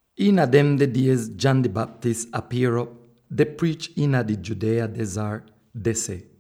Iina demde diez John di Baptist apier'op deh priich iina di Judea dezart deh seh,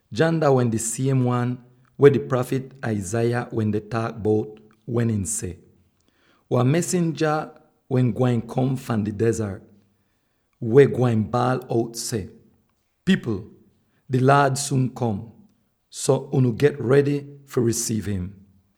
John dah wehn di siem wan weh di prafit Isaiah wende taak bout wen ihn seh: “Wan mesinja wehn gwain kom fahn di dezart, weh gwain baal out seh: ‘Pipl! Di Laad suun kom, so unu get redy fi risiiv im!’”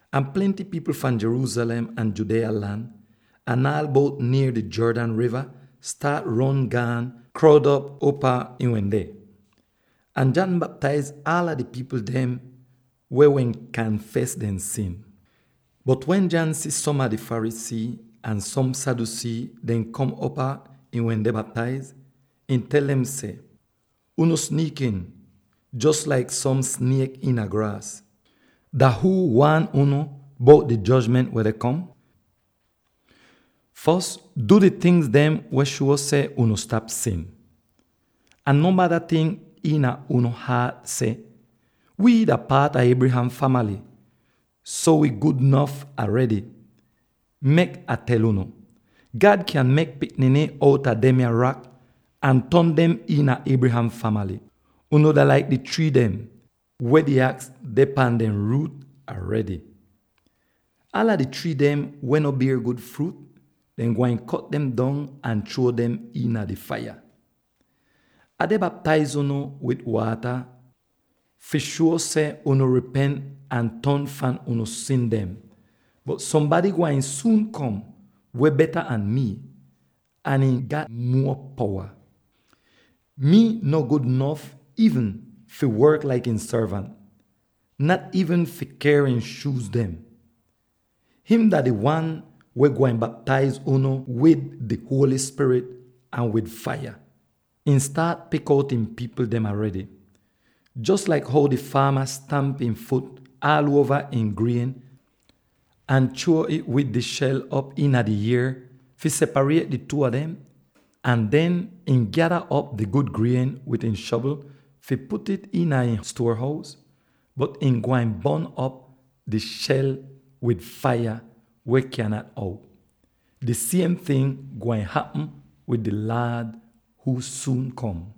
Ahn plenty pipl fahn Jerusalem, ahn Judea lan, ahn aal bout nier di Jordan riva staat ron gaan kroud op upaa ihn wende. Ahn John baptaiz aala di pipl dem weh wehn kanfes dehn sin. Bot wen John si som Pharisee ahn som Sadducee deh kom upaa ihn wende baptaiz, ihn tel dem seh, “Unu sniikin, jos laik som sniek iina graas! Dah huu waan unu bout di jojment weh deh kom? Fos du di tingz weh shuo seh unu stap sin. Ahn no bada tink iina unu haat seh, ‘Wii dah paat a Abraham famaly, so wi gud nof aredy!’ Mek Ah tel unu: God kyan mek pikniny outa demya rak ahn ton dem iina Abraham famaly! Unu dah laik di trii dem, weh di aks deh pan dehn ruut aredy. Aala di trii dem weh no bier gud fruut, dehn gwain kot dem dong ahn chruo dem iina di faiya. Ah deh baptaiz unu wid waata fi shuo seh unu ripent ahn ton fahn unu sin dem, bot sombady gwain suun kom weh beta an mii, ahn ihn gat muo powa. Mii no gud nof iivn fi work laik ihn sorvant, nat iivn fi ker ihn shuuz dem. Him dah di wan weh gwain baptaiz unu wid di Holy Spirit ahn wid faiya. Ihn staat pik out ihn pipl dem aredy, jos laik how di faama stamp ihn fut aal uova ihn grien ahn chruo'ih wid di shel op iina di ier fi separiet di two a dem, ahn den ihn gyada op di gud grien wid ihn shovl fi put'ih iina ihn stuor-hous; bot ihn gwain bon'op di shel wid faiya weh kyaahn out. Di siem ting gwain hapm wid di Laad huu suun kom.”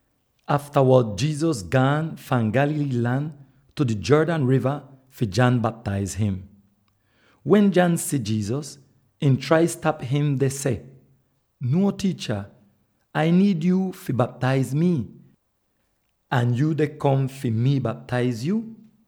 Aftawod Jesus gaan fahn Galilee lan tu di Jordan riva fi John baptaiz im. Wen John si Jesus, ihn trai stap im deh seh, “Nuo, tiicha. Ai niid yuu fi baptaiz mii, ahn yuu deh kom fi mii baptaiz yuu?”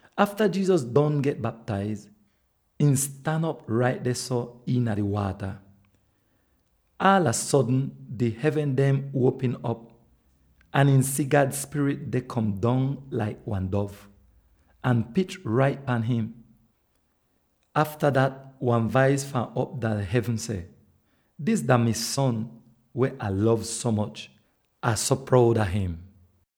Afta Jesus don get baptaiz, ihn stan op rait dehso iina di waata. Aalava sodn di hevn dem uopm op, ahn ihn si God Spirit deh kom dong laik wan dov, ahn pich rait pan im. Afta dat wan vais fahn op dah hevn seh, “Dis dah mi Son, weh Ah lov so moch. Ah so proud a im!”